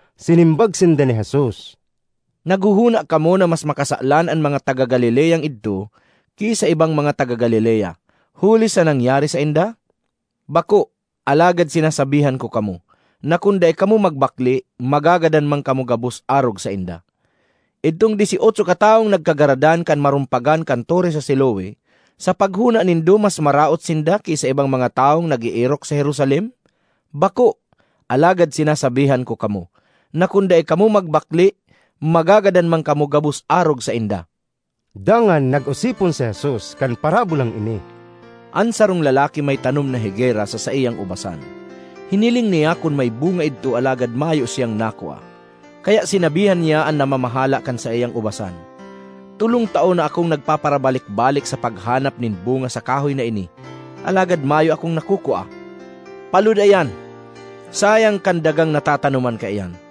Sinimbag sinda ni Jesus, “Naghohona kamo na mas makasalan an mga taga Galileang idto ki sa ibang mga taga Galilea, huli sa nangyari sainda? Bako! Alagad sinasabihan ko kamo na kun dai kamo magbakle, magagadan man kamo gabos arog sainda. Idtong dyes y otso katawong nagkagaradan kan marumpagan kan tore sa Siloe, sa paghona nindo mas maraot sinda ki sa ibang mga tawong nag-eerok sa Jerusalem? Bako! Alagad sinasabihan ko kamo na kun dai kamo magbakle, magagadan man kamo gabos arog sainda.” Dangan nag-osipon si Jesus kan parabolang ini, “An sarong lalaki may tanom na higera sa saiyang ubasan. Hiniling niya kun may bunga idto alagad mayo siyang nakua. Kaya sinabihan niya an namamahala kan saiyang ubasan, ‘Tolong taon na akong nagpaparabalik-balik sa paghanap nin bunga sa kahoy na ini, alagad mayo akong nakukua. Paloda iyan! Sayang kan dagang natatanoman kaiyan!’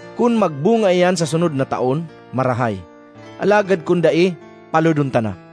Kun magbunga iyan sa sunod na taon, marahay; alagad kun dai palodon ta na.’”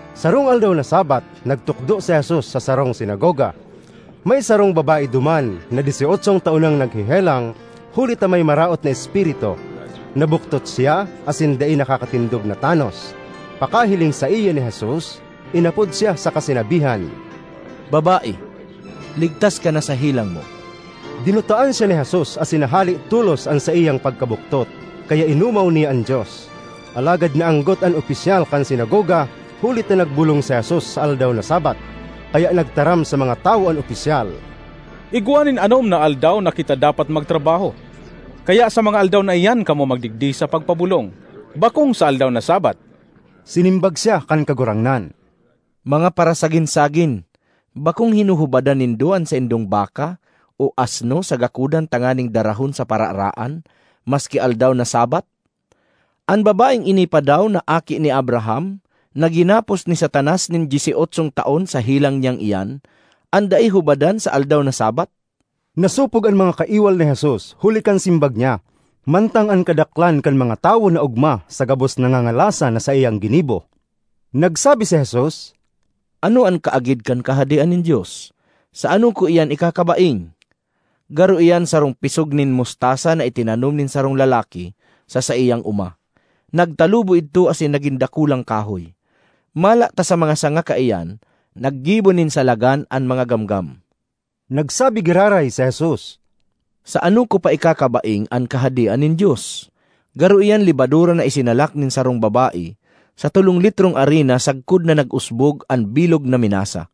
Sarong aldaw na Sabbath, nagtukdo si Jesus sa sarong sinagoga. May sarong babae duman na dyes y otsong taon nang naghehelang, huli ta may maraot na espiritu; nabuktot siya asin dai nakakatindog na tanos. Pagkahiling saiya ni Jesus, inapod siya saka sinabihan, “Babae, ligtas ka na sa helang mo!” Dinutaan siya ni Jesus asin nahale tolos an saiyang pagkabuktot; kaya inomaw niya an Dios. Alagad naanggot an opisyal kan sinagoga huli ta nagbolong si Jesus sa aldaw na Sabbath. Kaya nagtaram sa mga tawo an opisyal, “Igwa nin anom na aldaw na kita dapat magtrabaho, kaya sa mga aldaw na iyan kamo magdigdi sa pagpabolong, bakong sa aldaw na Sabbath!” Sinimbag siya kan Kagurangnan, “Mga parasagin-sagin! Bakong hinuhubadan nindo an saindong baka o asno sa gakodan tanganing darahon sa pararaan maski aldaw na Sabbath? An babaeng ini pa daw na aki ni Abraham, na ginapos ni Satanas nin dyes y otsong taon sa helang niyang iyan, an dai hubadan sa aldaw na Sabbath?” Nasopog an mga kaiwal ni Jesus huli kan simbag niya, mantang an kadaklan kan mga tawo naogma sa gabos na ngangalasan na saiyang ginibo. Nagsabi si Jesus, “Ano an kaagid kan Kahadean nin Dios? Sa ano ko iyan ikakabaing? Garo iyan sarong pisog nin mustasa na itinanom nin sarong lalaki sa saiyang oma. Nagtalubo idto asin nagin dakulang kahoy, mala ta sa mga sanga kaiyan naggibo nin salagan an mga gamgam.” Nagsabi giraray si Jesus, “Sa ano ko pa ikakabaing an Kahadean nin Dios? Garo iyan lebadura na isinalak nin sarong babae sa tolong litrong arina sagkod na nag-usbog an bilog na minasa.”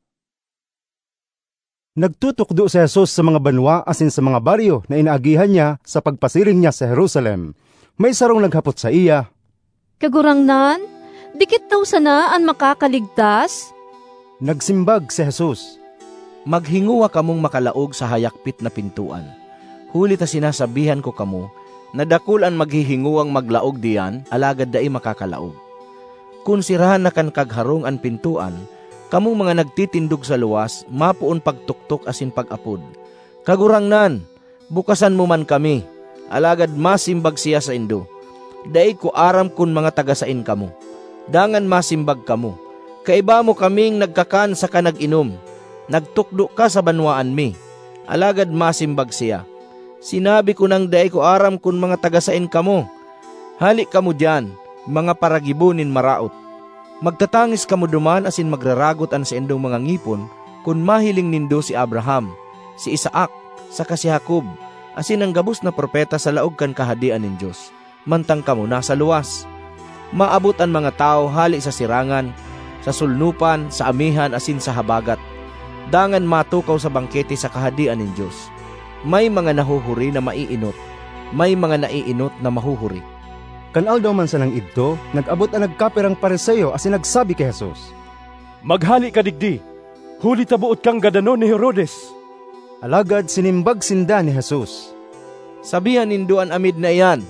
Nagtutukdo si Jesus sa mga banwa asin sa mga baryo na inaagihan niya sa pagpasiring niya sa Jerusalem. May sarong naghapot saiya, “Kagurangnan, dikit daw sana an makakaligtas?” Nagsimbag si Jesus, ”Maghingowa kamong makalaog sa hayakpit na pintoan; huli ta sinasabihan ko kamo na dakul an maghihingowang maglaog diyan alagad dai makakalaog. Kun serahan na kan kagharong an pintoan, kamong mga nagtitindog sa luwas mapoon pagtoktok asin pag-apod, ‘Kagurangnan, bukasan mo man kami!’ Alagad masimbag siya saindo, ‘Dai ko aram kun mga taga saen kamo!’ Dangan masimbag kamo, ‘Kaiba mo kaming nagkakan saka nag-inom; nagtukdo ka sa banwaan mi!’ Alagad masimbag siya, ‘Sinabi ko nang dai ko aram kun mga taga saen kamo! Hale kamo diyan, mga paragibo nin maraot!’ Magtatangis kamo duman asin magraragot an saindong mga ngipon kun mahiling nindo si Abraham, si Isaac saka si Jacob asin an gabos na propeta sa laog kan Kahadean nin Dios, mantang kamo nasa luwas! Maabot an mga tawo hale sa sirangan, sa solnopan, sa amihan asin sa habagat, dangan matukaw sa bangkete sa Kahadean nin Dios. May mga nahuhuri na maeenot; may mga naeenot na mahuhuri.” Kan aldaw man sanang idto, nag-abot an nagkapirang Fariseo asin nagsabi ki Jesus, “Maghale ka digdi, huli ta boot kang gadanon ni Herodes.” Alagad sinimbag sinda ni Jesus, “Sabihan nindo an amid na iyan,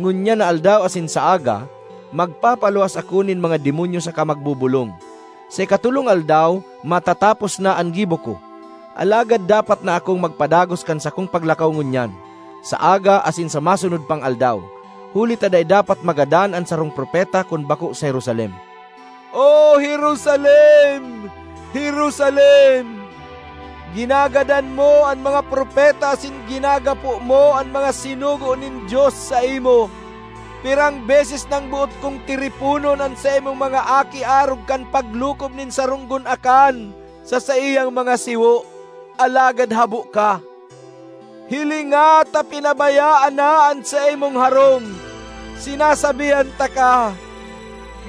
‘Ngunyan na aldaw asin sa aga, magpapaluwas ako nin mga demonyo saka magbobolong; sa ikatolong aldaw, matatapos na an gibo ko.’ Alagad dapat na akong magpadagos kan sakong paglakaw ngunyan, sa aga, asin sa masunod pang aldaw, huli ta dai dapat magadan an sarong propeta kun bako sa Jerusalem. ”O Jerusalem, Jerusalem! Ginagadan mo an mga propeta asin ginagapo mo an mga sinugo nin Dios saimo! Pirang beses nang boot kong tiriponon an saimong mga aki arog kan paglukob nin sarong gunakan sa saiyang mga siwo, alagad habo ka! Hilinga, ta pinabayaan na an saimong harong. Sinasabihan taka,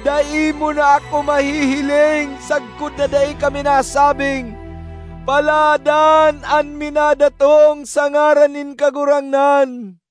dai mo na ako mahihiling sagkod na dai ka minasabing, ‘Paladan an minadatong sa ngaran nin Kagurangnan.’”